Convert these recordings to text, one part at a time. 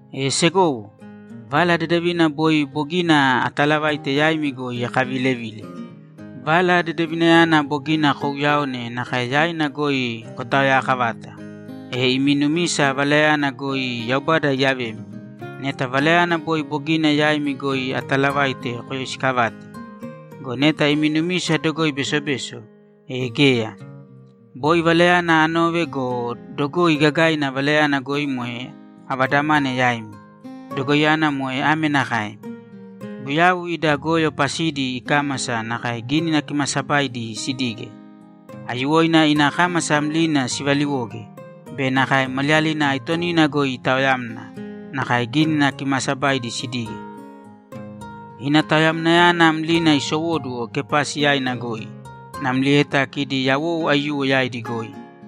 E segowo, Vala Dedevina boi bogina atalavaite yaimi goi, akavilevile. Vala Dedevinayana bogina kouyaone nakae yaina goi kotaoyaakavata, e imi numisa Valayana goi Yaubada iyavemi, neta Valayana boi bogina yaimi goi ataalavaite koyoisikavate. Go neta imi numisa dogoi besobeso, e geya. Boi Valayana anove go, dogoi gagaina Valayana goi moe avadamane yaimi. Dogoiyana moe ame nakae: Guyau ida goyo pasidi ikámasa nakae Gínina Kimaasabaidi sidige. Aiyuwoina ina kámasa mlina sivaliwoge go, maliyalina aitonina goi itaoyamna nakae Gínina Kimaasabaidi sidige. Ina taoyamnayana mlina isowóduwo Kepasi yaina goi namlieta kidi yawou aiyuwo yaidi goi.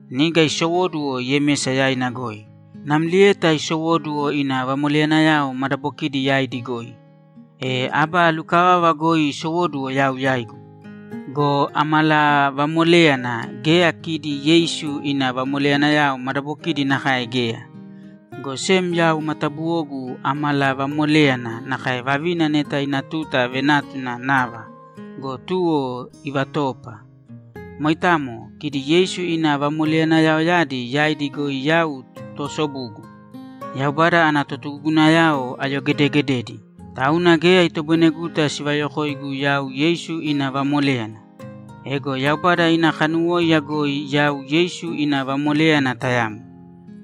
Niga isowóduwo Yemesa yaina goi, namlieta isowóduwo ina vamoleyanayao madabokidi yaidi goi. E aba lukavava goi isowóduwo yau yaigu go, amalavamoléyana geya kidi Yeisu ina vamoleyanayao madabokidi nakae geya. Go sem yau matabuwogu amalavamoléyana nakae vavina neta ina tuta venátuna nava go, tuwo ivatoopa. Moitamo. Kidi Yeisu ina vamoleyanayaoyadi yaidi goi yau toosobugu. Yaubada ana totugugunayao ayogedegededi, tauna geya itoboineguta sivayokoigu yau Yeisu ina vamoléyana. Ego Yaubada ina kanuwóiya goi yau Yeisu ina vamoléyana tayamo.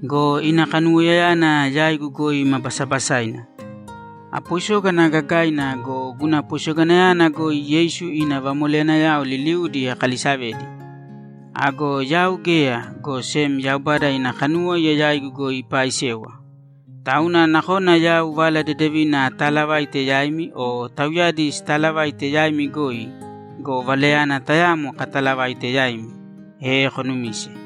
Go ina kanuwoiyayana yaigu goi ma basabasaina. Apoisógana gagaina go, guna poisoganayana goi Yeisu ina vamoleyanayao liliudi akalisavedi. Ago yau geya, go sem Yaubada ina kanuwóiya yaigu goi ipaaisewa. Tauna nakona yau Vala Dedevina ataalavaite yaimi o tauyadi sitaalavaite yaimi goi go, Valayana tayamo kataalavaite yaimi, e konumise.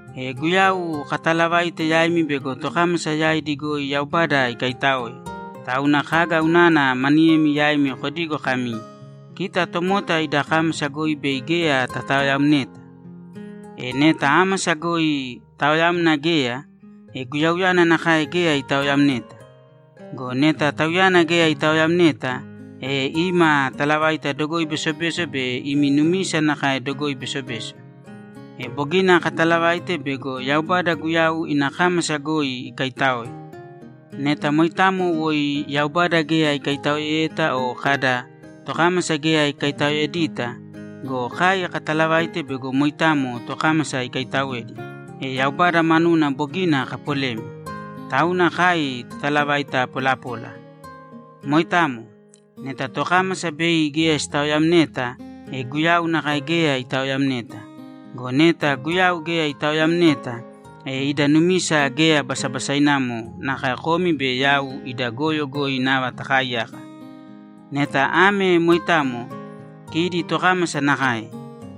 E Guyau kataalavaite yaimi bego tokámasa yaidi goi Yaubada ikaitáoe, tauna kaga unana maniyemi yaimi kodigo kami, ‘Kita tomota ida kámasa goi bei geya tataoyamneta’? E, neta ámasa goi taoyamna geya, e Guyauyana nakae geya itaoyamneta. Go neta Tauyana geya itaoyamneta, e ima talavaita dogoi besobeso be imi numisa nakae dogoi besobeso. E bogina katalavaite bego Yaubada Guyau ina kámasa goi ikaitáoe. Neta moitamo woi Yaubada geya ikaitaoeyeta o kada, ‘Tokámasa geya ikaitaoedita’ go, kai katalavaite bego moitamo tokámasa ikaitaoedi, e Yaubada manuna bogina kapolemi, tauna kai totalavaita polapola. Moitamo. Neta tokámasa bei geya sitaoyamneta, e Guyau nakae geya itaoyamneta. Go neta Guyau geya itaoyamneta, e ida numisa geya basabasainamo, nakae komi be yau ida goyo goi nava takaaiyaka. Neta ame moitamo, kidi tokámasa nakae;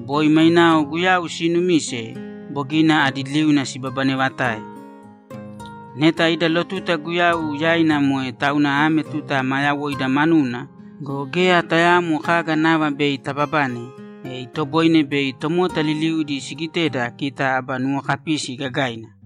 boi mainao Guyau siinumise bogina adi liuna sibabanevatae. Neta ida lotuta Guyau yaina moe tauna ame tuta ma yawoida manuna go, geya tayaamo kaga nava bei tababane, e itoboine bei tomota liliudi sigiteda kita aba nuwokapisi gagaina.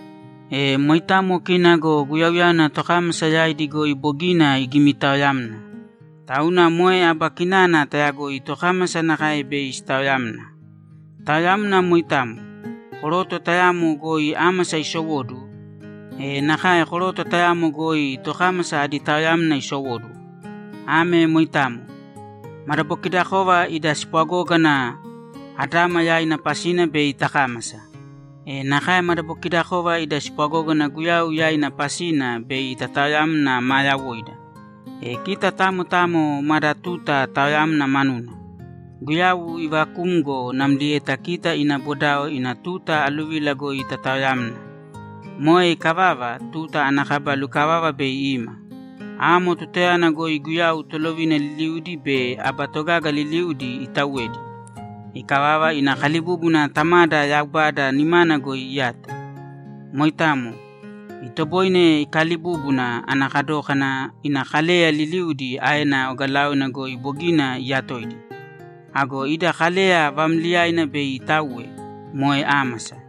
E moitamo kina go Guyauyana tokámasa yaidi goi bogina igimitaoyamna. Tauna moe aba kinana tayagoi tokámasa nakae bei sitaoyamna. Taoyamna moitamo. Koroto tayamo goi ámasa isowóduwo, e nakae koroto tayamo goi tokámasa adi taoyamna isowóduwo. Ame moitamo. Madabokidakova ida spwagógana Adama yaina pasina bei takámasa. E nakae madabokidakova ida spwagógana Guyau yaina pasina bei tataoyamna ma yawoida. E kita tamo tamo mada tuta taoyamna manuna. Guyau ivakumgo namlieta kita ina bodao ina tuta aluvila goi tataoyamna. Moe ikavava, tuta ana kaba lukavava bei ima. Amo tutayana goi Guyau tolovina liliudi be aba togaga liliudi itauwedi. Ikavava, ina kalibúbuna Tamada Yaubada nimana goi iyato. Moitamo. Itoboine ikaalibúbuna ana kadókana ina kaleyayao liliudi aena ogalaoina goi bogina iyatoidi. Ago ida kaleya vaamliyaina bei itauwe, moe ámasa.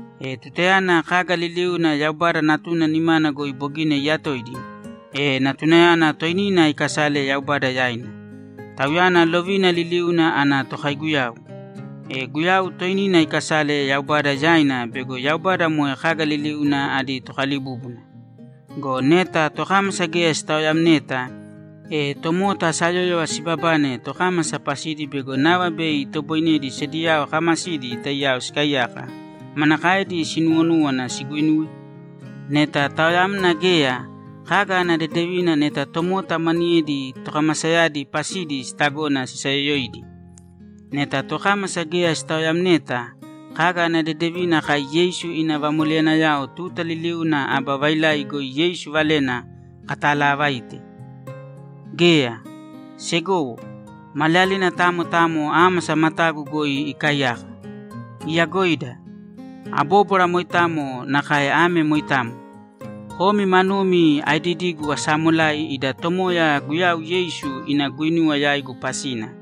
E tutayana kaga liliuna Yaubada Natuna nimana goi bogina iyatoidi, e Natunayana toinina ikasale Yaubada yaina. Tauyana lovina liliuna ana tokaiguyau. E Guyau toinina ikasale Yaubada yaina bego Yaubada moe kaga liliuna adi Tokalibúbuna. Go neta tokámasa geya sitaoyamneta, e tomota sayóyova sibabane tokámasa pasidi bego nava bei itoboinedi sediyao kaamasidi taiyao sikaiyaka manakaedi sinuwonúwana siguinuwe? Neta taoyamna geya, kaga ana dedevina neta tomota maniyedi tokamasayadi pasidi sitagona sisayoyoidi? Neta tokámasa geya sitaoyamneta, kaga ana dedevina kai Yeisu ina vamoleyanayao tuta liliuna aba vailai goi Yeisu valena kataalavaite? Geya! Segowo, maliyalina tamo tamo ámasa matagu goi ikaaiyaka. Iyagoida! Abóbwara moitamo nakae ame moitamo: Komi manumi aedidigu asaamolai ida Tomoya Guyau Yeisu ina guinuwa yaigu pasina.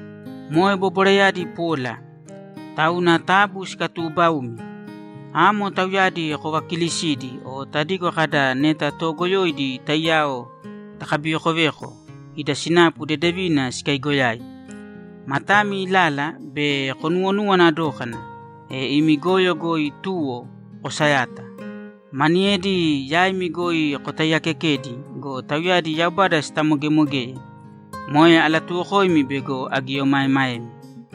Moe bobwarayadi pola. Tauna taabu sikatuubaūmi. Amo tauyadi kovakilisīdi o tadigo kada, ‘Neta toogoyoidi taiyao takabivekoveko, ida sinapu dedevina sikaigoyai.’ Matami ilāla be konuwonuwana dōkana, e imi goyo goi tuwo, kosayāta. Maniyedi yaimi goi kotaiyaakekedi go, tauyadi Yaubada sitamogemogeye. Moe alatuwokoimi bego agieomaemaemi.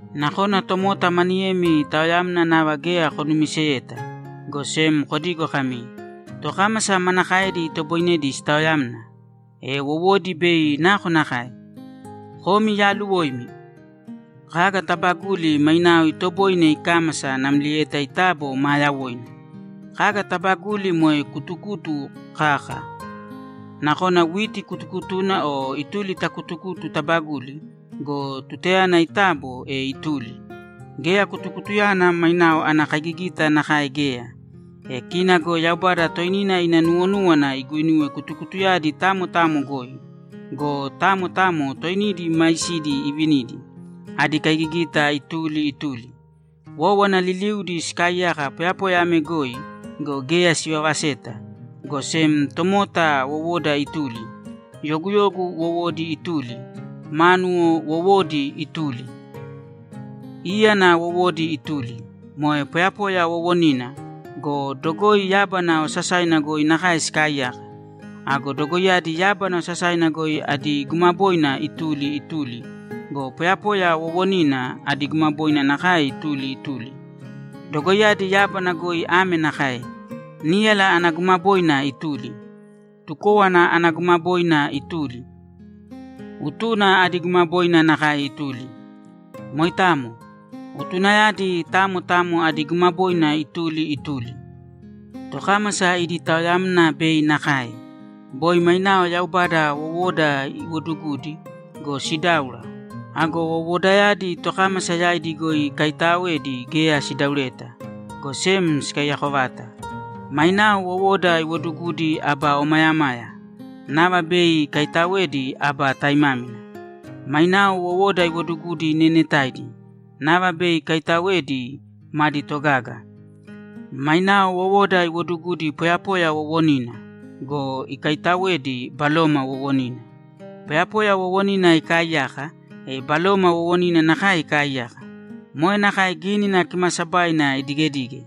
Nakona tomota maniyemi taoyamna nava geya konumiseta, go sem kodigo kami, ‘Tokámasa manakaedi itoboinedi sitaoyamna? E wowodi bei nakonakae?’ Komi yaaluwoimi! Kaga taabaguli mainao itoboine ikámasa namlieta itabo maa yawoina. Kaga taabaguli moe kutukutu kaka. Nakona witi kutukutuna o ituli ta kutukutu tabaguli go, tutayana itabo, e ituli. Geya kutukutuyana mainao ana kaigigita nakae geya. E kina go Yaubada toinina ina nuwonúwana iguinuwe kutukutuyadi tamo tamo goi go, tamo tamo toinidi maisidi ivinidi, adi kaigigita ituli ituli. Wówana liliudi sikaaiyaka poyapoya ame goi go, geya sivavaseta, go sem tomota wowoda ituli, yoguyogu wowodi ituli, mánuwo wowodi ituli, íyana wowodi ituli. Moe poyapoya wowonina go, dogoi yábana osasaina goi nakae sikaaiyaka. Ago dogoiyadi yábana osasaina goi adi gumaboina ituli ituli go, poyapoya wowonina adi gumaboina nakae ituli ituli. Dogoiyadi yábana goi ame nakae: Níyala ana gumaboina ituli, tukówana ana gumaboina ituli, utuna adi gumaboina nakae ituli. Moitamo. Utunayadi tamo tamo adi gumaboina ituli ituli. Tokámasa idi taoyamna bei nakae. Boi mainao Yaubada wowoda iwodugudi go, sidáura. Ago wowodayadi tokámasa yaidi goi ikaitaaoedi geya sidaureta, go sem sikaiyako vata. Mainao wowoda iwodugudi aba omayamaya. Nava bei ikaitaoedi aba taimámina. Mainao wowoda iwodugudi neenetaidi. Nava bei ikaitaoedi madi togaga. Mainao wowoda iwodugudi poyapoya wowonina go, ikaitaoedi, baloma wowonina. Poyapoya wowonina ikaaiyaka, e baloma wowonina nakae ikaaiyaka. Moe nakae Gínina Kimaasabaina idigedige: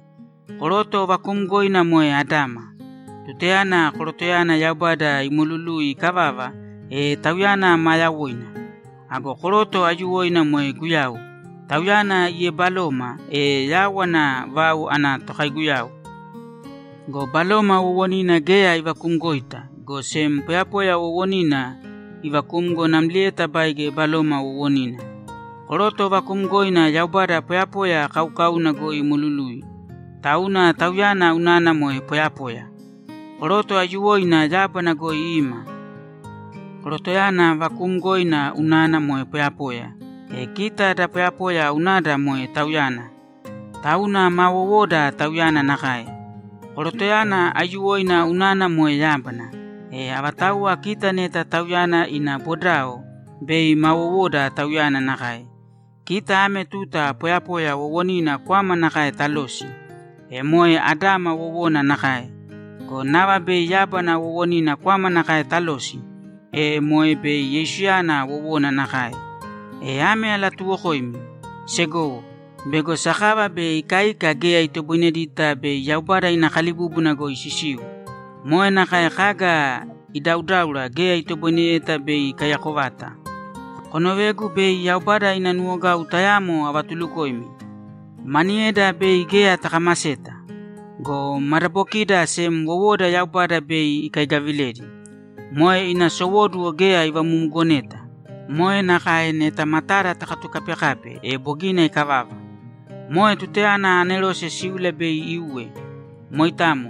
Koroto vakuumgoina moe Adama. Tutayana korotoyana Yaubada imolului ikavava, e tauyana maa yawoina. Ago koroto aiyuwoina moe Guyau. Tauyana iebaloma, e yawana vau ana tokaiguyau. Go baloma wowonina geya ivakumgoita, go sem poyapoya wowonina ivakumgo namlieta baige baloma wowonina. Koroto vakuumgoina Yaubada poyapoya kaukauna goi imolului, tauna tauyana unana moe poyapoya. Koroto aiyuwoina yábana goi ima. Korotoyana vakuumgoina unana moe poyapoya, e kita da poyapoya unada moe tauyana, tauna ma wowoda tauyana nakae. Korotoyana aiyuwoina unana moe yábana, e avatauwa kita neta Tauyana ina bodao, bei ma wowoda Tauyana nakae. Kita ame tuta poyapoya wowonina kwama nakae talosi, e moe Adama wowona nakae go, nava bei yábana wowonina kwama nakae talosi, e moe bei Yeisuyana wowona nakae. E ame alatuwokoimi, segowo, bego sakava be ikaika geya itoboinedita bei Yaubada ina kalibúbuna goi sisiu. Moe nakae kaga idaudáura geya itoboineyeta bei ikaiyako vata. Konovēgu bei Yaubada ina nuwogau tayamo avatulukoimi. Maniyeda bei geya takamaseta. Go madabokida sem wowoda Yaubada bei ikaigaviledi. Moe ina sowóduwo geya ivamumugoneta. Moe nakae neta matada tatukapekape, e bogina ikavava. Moe tutayana anerose síula bei iuwe. Moitamo.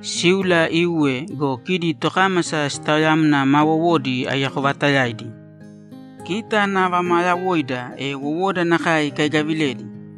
Síula iuwe go, kidi tokámasa sitaoyamna ma wowodi aiyako vaatayaidi. Kita nava maa yawoida, e wowoda nakae ikaigaviledi.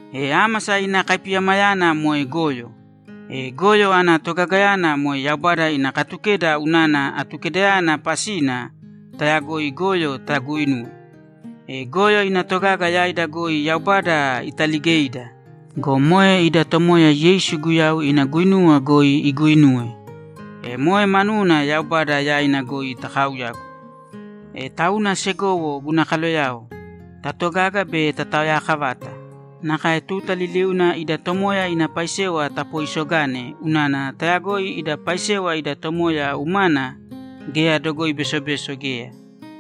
E ámasa ina kaipiyamayana moe goyo. E goyo ana togagayana moe Yaubada ina Katukeda unana Atukedayana pasina tayagoi goyo taguinuwe. E goyo ina togaga yaida goi Yaubada italigeida go, moe ida Tomoya Yeisu Guyau ina guinuwa goi iguinuwe, e moe manuna Yaubada yaina goi takauyāgu. E tauna segowo guna kaloyao, tatogāga be tataoyakavāta. Nakae tuta liliuna ida Tomoya ina paisewa tapooisogāne unana tayagoi ida paisewa ida Tomoya umana geya dogoi besobeso geya.